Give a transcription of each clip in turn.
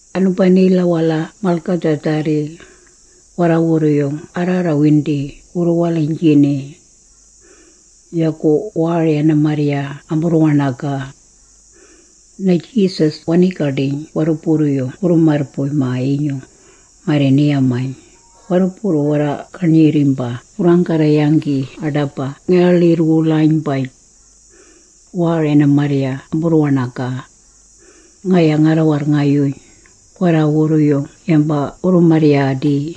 Anubanila-wala malgadhaadharri, warraawurru-yung arraarrawindi wurru-waliynjini. Yagu waari ana-marrya amburru-waṉagaa. Na-Jesus wanii-gaḏiyn warruburru-yung wurru-marrbuy-maa-yinyung, marri ni-yamayn, “Warruburru warra-garnyirrimba wurraanggarra-yanggi aḏaba ngi-waḻirr-wulaynbaj. Waari ana-marrya amburru-waṉagaa. Ngaya ngarra-warrngayuyn, warraawurru yamba wurru-marryaadii.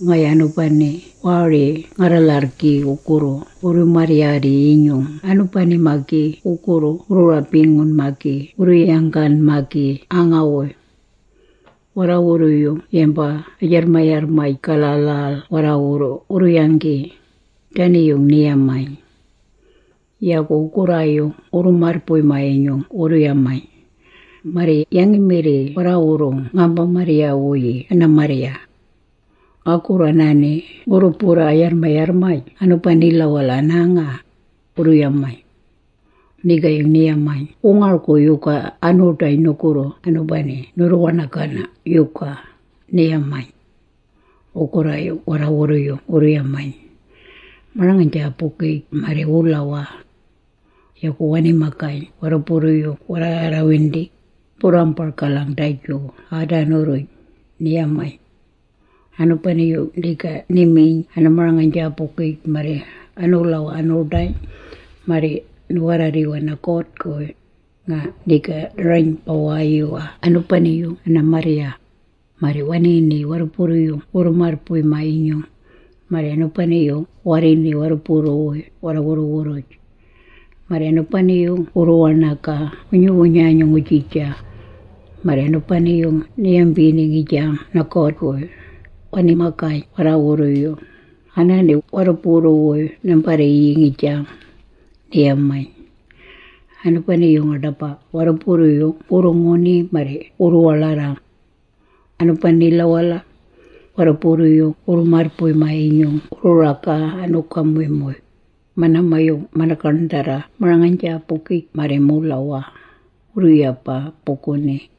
Ngaya anubani waari ngarra-lharrgi wugurru wurru-marryaadi-yinyung anubani-magi wugurru wurru-rabingun-magi wurru-yanggan-magi aanga-wuy. Warraawurru yamba a-jarrmayarrmaj-gala a-lhal warraawurru wuu-yanggi.” Dani-yung ni-yamayn. Yagu wugurraayung wurru-marrbuy-maa-yinyung wurru-yamayn, “Marri yangi-mirri warraawurru ngaamba-marrya-wuyii ana-marrya? Ngagurru anaani ngurru-burraa a-yarrmayarrmaj anubanila-wala anaanga,” wurru-yamayn. Nigaayung ni-yamayn “Wu-ngargu yuga anu-ḏayn nugurru anubani nurru-waṉagana yuga?” ni-yamayn. Wugurraayung warraawurru-yung wurru-yamayn, “Marang-aynjaabugij marri wulawaa.” Yagu wani-magayn warruburru warraarrawindi, “Numburraambargalang daju aaban-duj,” ni-yamayn. Anubani-yung niga ni-miyn ana-marang-aynjaabugij marri anuulawaa anu-ḏayn, marri nu-warraarriwaa na-God-guy, nga niga ni-rayn-bawaayuwaa anubani-yung ana-marrya, marri waniini warruburru-yung wurru-marrbuy-maa-yinyung, marri anubani-yung warriini warruburru-wuy warra-wurru-wurruj. Marri anubani-yung wurru-waṉagaa wunyu-wunyanyung ngujija. Marri anubani-yung ni-yambini ngijang na-God-guy. Nga wani-magayn warraawurru-wuy, “Anaani warruburru-wuy nambarriiyii ngijang,” ni-yamayn. Anubani-yung aḏaba warruburru-yung wurru-nguni marri wurru-waḻarrang. Anubanila-wala, warruburru-yung wurru-marrbuy-maa-yinyung wurru-ragaa anu-gamuymuy, manaama-yung mana-gaṉdharra marang-aynjaabugij marri muulawaa, wurru-yabaa buguni.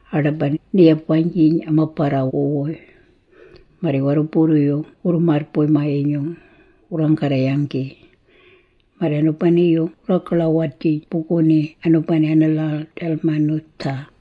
Aḏaba ni-yabaynjiyn ama-barrawu-wuy, marri warruburru-yung wurru-marrbuy-maa-yinyung, wurraanggarra-yanggi. Marri anubani-yung wurraagaḻawajiyn buguni anubani ana-lhal Dalmanutha.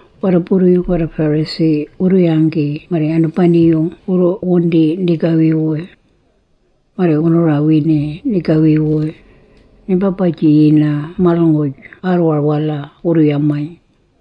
Warruburru-yung warra-Pharisee wurru-yanggi marri anubani-yung wurru-wundi nigawi-wuy. Marri wunu-rawini nigawi-wuy, “Nimba-bajiyina malnguj aarrwar-wala.” wurru-yamayn.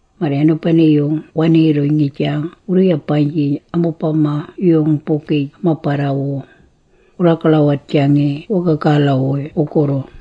Marri anubani-yung waniirruyn, ngijang wurru-yabaynjiyn amubama-yung-bugij ama-barrawu, wurraagaḻawajangi wagagala-wuy wugurru.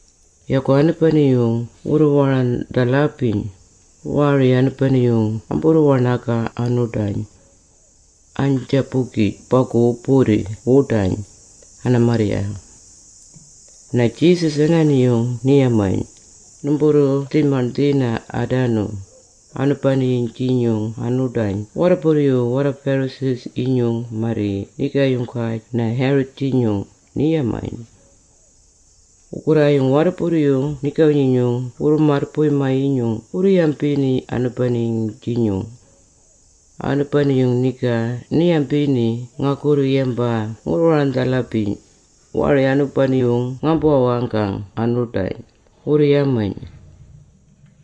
Yagu anubani-yung wurru-warandhalabiyn, waari anubani-yung amburru-waṉagaa anu-ḏayn. Aynjaabugij bagu wu-burri wuḏayn, ana-marrya. Na-Jesus anaani-yung ni-yamaa, “Numburru-dhi-maṉdhina aadanu, anubani-yung-jinyung anu-ḏayn warruburru-yinyung warra-Pharisee-yinyung marri nigaayunggaj na-Herod-jinyung,” ni-yamaa. Wugurraayung warruburru-yung nigawi-nyinyung wurru-marrbuy-maa-yinyung wurru-yambini anubani-yung-jinyung. “Anubani-yung niga ni-yambini ngagurru yamba ngurru-warandhalabiyn, waari anubani-yung ngaambu-waṉagang anu-ḏayn,” wurru-yamayn.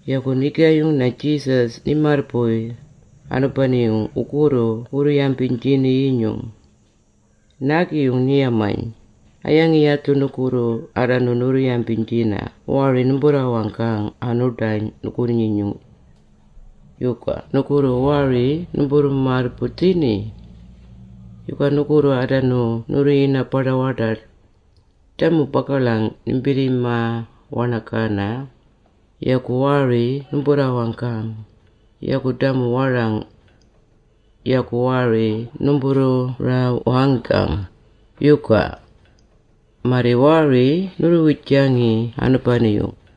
Yagu nigaayung na-Jesus ni-marrbuy, anubani-yung wugurru wurru-yambiynjini-yinyung. Naagi-yung ni-yamayn, “A-yangi yadhu nugurru aadanu nurru-yambiynjina waari numburru-waṉagang anu-ḏayn nugurri-nyinyung? Yuga nugurru waari numburru-marrbuy-dhini? Yuga nugurru aadanu nurru-yina-baḏa-waḏaḏ? Damu bagaḻang nimbirrima-waṉagana! Yagu waari numburraarranggang? Yagu damu warang! Yagu waari numburraawanggang, yuga? Marri waari nurru-wijangi anubani-yung?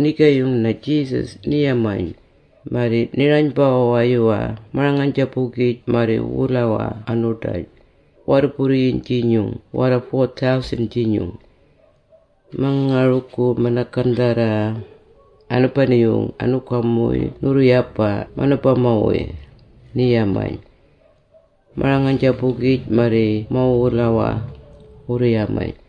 Nigaayung na-Jesus ni-yamayn, “Marri nga-rayn-bawaayuwaa marang-aynjaabugij marri wulawaa anu-ḏayn, warruburru-yung-jinyung warra-4000-jinyung. Ma-ngargu mana-gaṉdharra, anubani-yung anu-gamuymuy nurru-yabaa manubama-wuy?” ni-yamayn. “Marang-aynjaabugij marri muulawaa,” wurru-yamayn.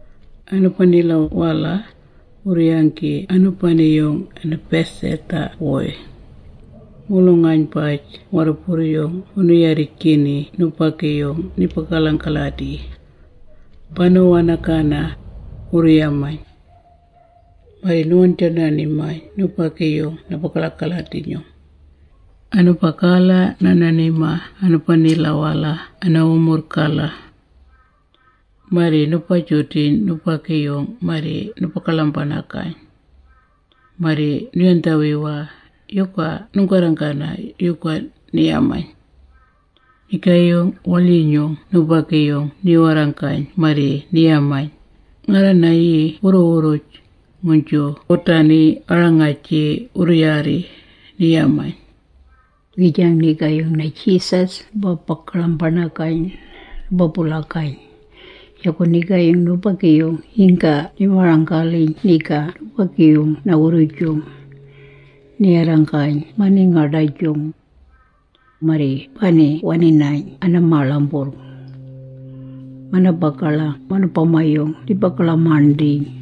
Anubanila-wala, wurru-yanggi anubani-yung Bethsaida-wuy. Mulung-aynbaj warruburru-yung wunu-yarrijgini nubagi-yung ni-bagaḻang-aladi. “Banu-waṉagana,” wurru-yamayn. Marri nu-waṉjaaṉa-ṉimayn nubagi-yung na-bagaḻang-aladi-nyung. Anubagala naaṉa-ṉimaa anubanila-wala ana-wumurrng-gala. Marri nu-ba-judangi nubagi-yung-guy marri nu-bagaḻang-baṉagayn. Marri nu-yandhawiwayn, “Yuga nunggarranggana yuga?” ni-yamayn. Nigaayung na-waḻyinyung nubagi-yung ni-warranggayn marri ni-yamayn, “Ngarra-nayii wurru-wurruj, nguynju wudani a-rangag-jii wurru-yaarri,” ni-yamayn. Ngijang nigaayung na-Jesus nu-bagaḻang-baṉagayn, nu-ba-bulagayn. Yagu nigaayung nubagi-yung yingga ni-marang-galiyn niga nubagi-yung na-wurrujung, ni-warranggayn amaningaḏajung. Marri bani wani-nayn ana-maaḻamburrg. Mana-bagaḻang manubama-yung ni-bagaḻang-maṉdhiiyn.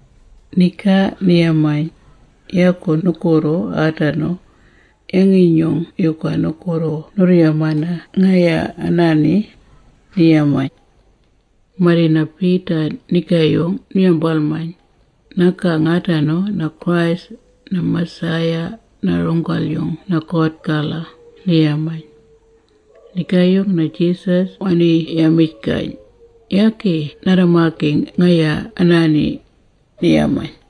Nigaayung ni-yamayn, “Yagu nugurru aadanu, yangi-nyung yuga nugurru nurru-yamana ngaya anaani?” ni-yamayn. Marri na-Peter nigaayung nu-yambalmayn, “Nagang aadanu na-Christ, na-Messiah, na-runggal-yung na-God-gala,” ni-yamayn. Nigaayung na-Jesus wani-yamijgayn, “Yagi narra-magi ngaya anaani,” ni-yamayn.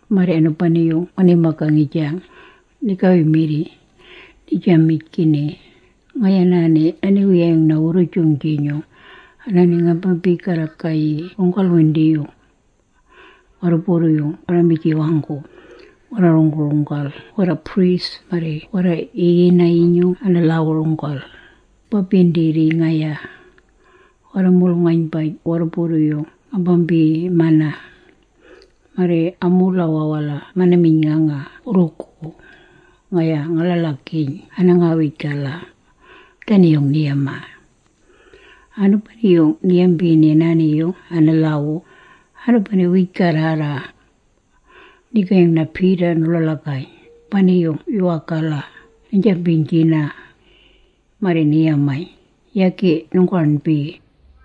Marri anubani-yung wani-magaa ngijang, nigawi-mirri, nii-jamijgini, “Ngaya anaani na-Niwiyayung na-Wurrujung-jinyung, anaani ngambambii-garragayii runggal-windiyung. Warruburru-yung warra-mijiwanggu, warra-runggu-runggal warra-priest marri warra-yiyini-yinyung ana-lhaawu-runggal, ngambambiindirrii ngaya. Warra-mulung-aynbaj warruburru-yung ngambambiimana. Marri amuulawaa-wala mana-miyn.nganga wurrugu, ngaya nga-ḻaḻagiiyn ana-ngawij-gala.” Dani-yung ni-yamaa. Anubani-yung ni-yambini anaani-yung ana-lhaawu, anubani wiij-garrarra. Nigaayung na-Peter nu-ḻaḻagayn, “Baaṉiyn yuwaagu, naynjambiynjina.” Marri ni-yamayn, “Yagi nunggaṉbi!”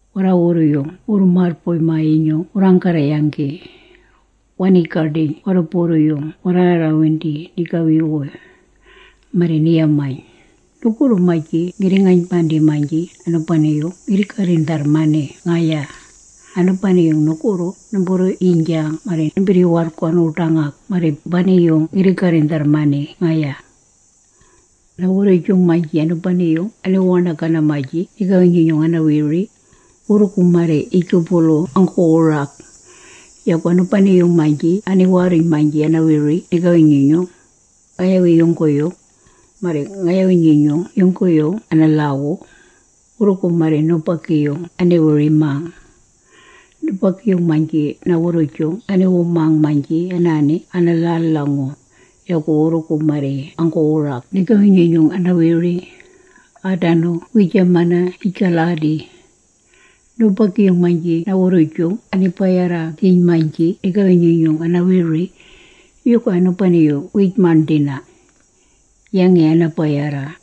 Warraawurru-yung wurru-marrbuy-maa-yinyung wurraanggarra-yanggi. Wanii-gaḏiyn warruburru-yung warraarraarrawindi nigawi-wuy. Marri ni-yamayn, “Nugurru-maynji ngirri-ngaynbandii-maynji anubani-yung ngirri-garrindharrmani ngaya, anubani-yung nugurru numburru-yiynjang marri nimbirri-warrgu anu-ḏangag marri bani-yung ngirri-garrindharrmani ngaya. “Na-wurrujung-maynji anubani-yung aniwu-waṉagana-maynji nigawi-nyinyung ana-wiri, wurrugu marri yijgubulu anggu-wurag. Yagu anubani-yung-maynji aniwaarruyn-maynji ana-wiri nigawi-nyinyung, ngayawi yungguyung, marri ngayawi-nyinyung yungguyung ana-lhaawu, wurrugu marri nubagi-yung ani-wiri-mang. Nubagi-yung-maynji na-wurrujung aniwu-mang-maynji anaani ana-lhal-lhangu, yagu wurrugu marri anggu-wurag nigawi-nyinyung ana-wiri, aadanu wiijamana yij-galadi. Nubagi-yung-maynji na-wurrujung ani-bayarra-giiyn-maynji nigawi-nyinyung ana-wiri, yuga anubani-yung wiij-maṉdhina? Yangi ana-bayarra?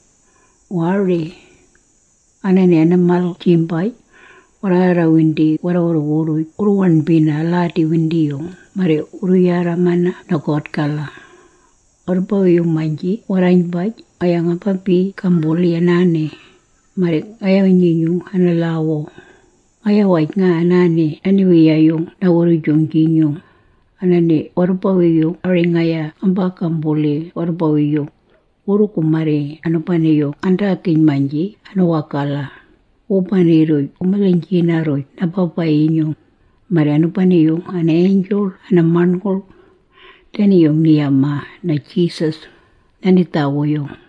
Waari! “Anaani ana-malg-jimbaj, warraarrawindi warra-wurru-wurruj wurru-waṉbina aladi-windiyung marri wurru-yarramana na-God-gala. Warrubawi-yung-maynji warraaynbaj ngaya ngambii-gambulii anaani, marri ngayawi-nyinyung ana-lhaawu, ngaya-waj nga anaani na-Niwiyayung na-Wurrujung-jinyung, anaani warrubawi-yung ari ngaya ngambaa-gambulang warrubawi-yung, wurrugu marri anubani-yung ngandaagiyn-maynji anuwagala, wubani-rruj wu-milhiynjina-rruj na-Baba-yinyung, marri anubani-yung ana-angel ana-maṉngulg.” Dani-yung ni-yamaa na-Jesus, na-nidhaawu-yung.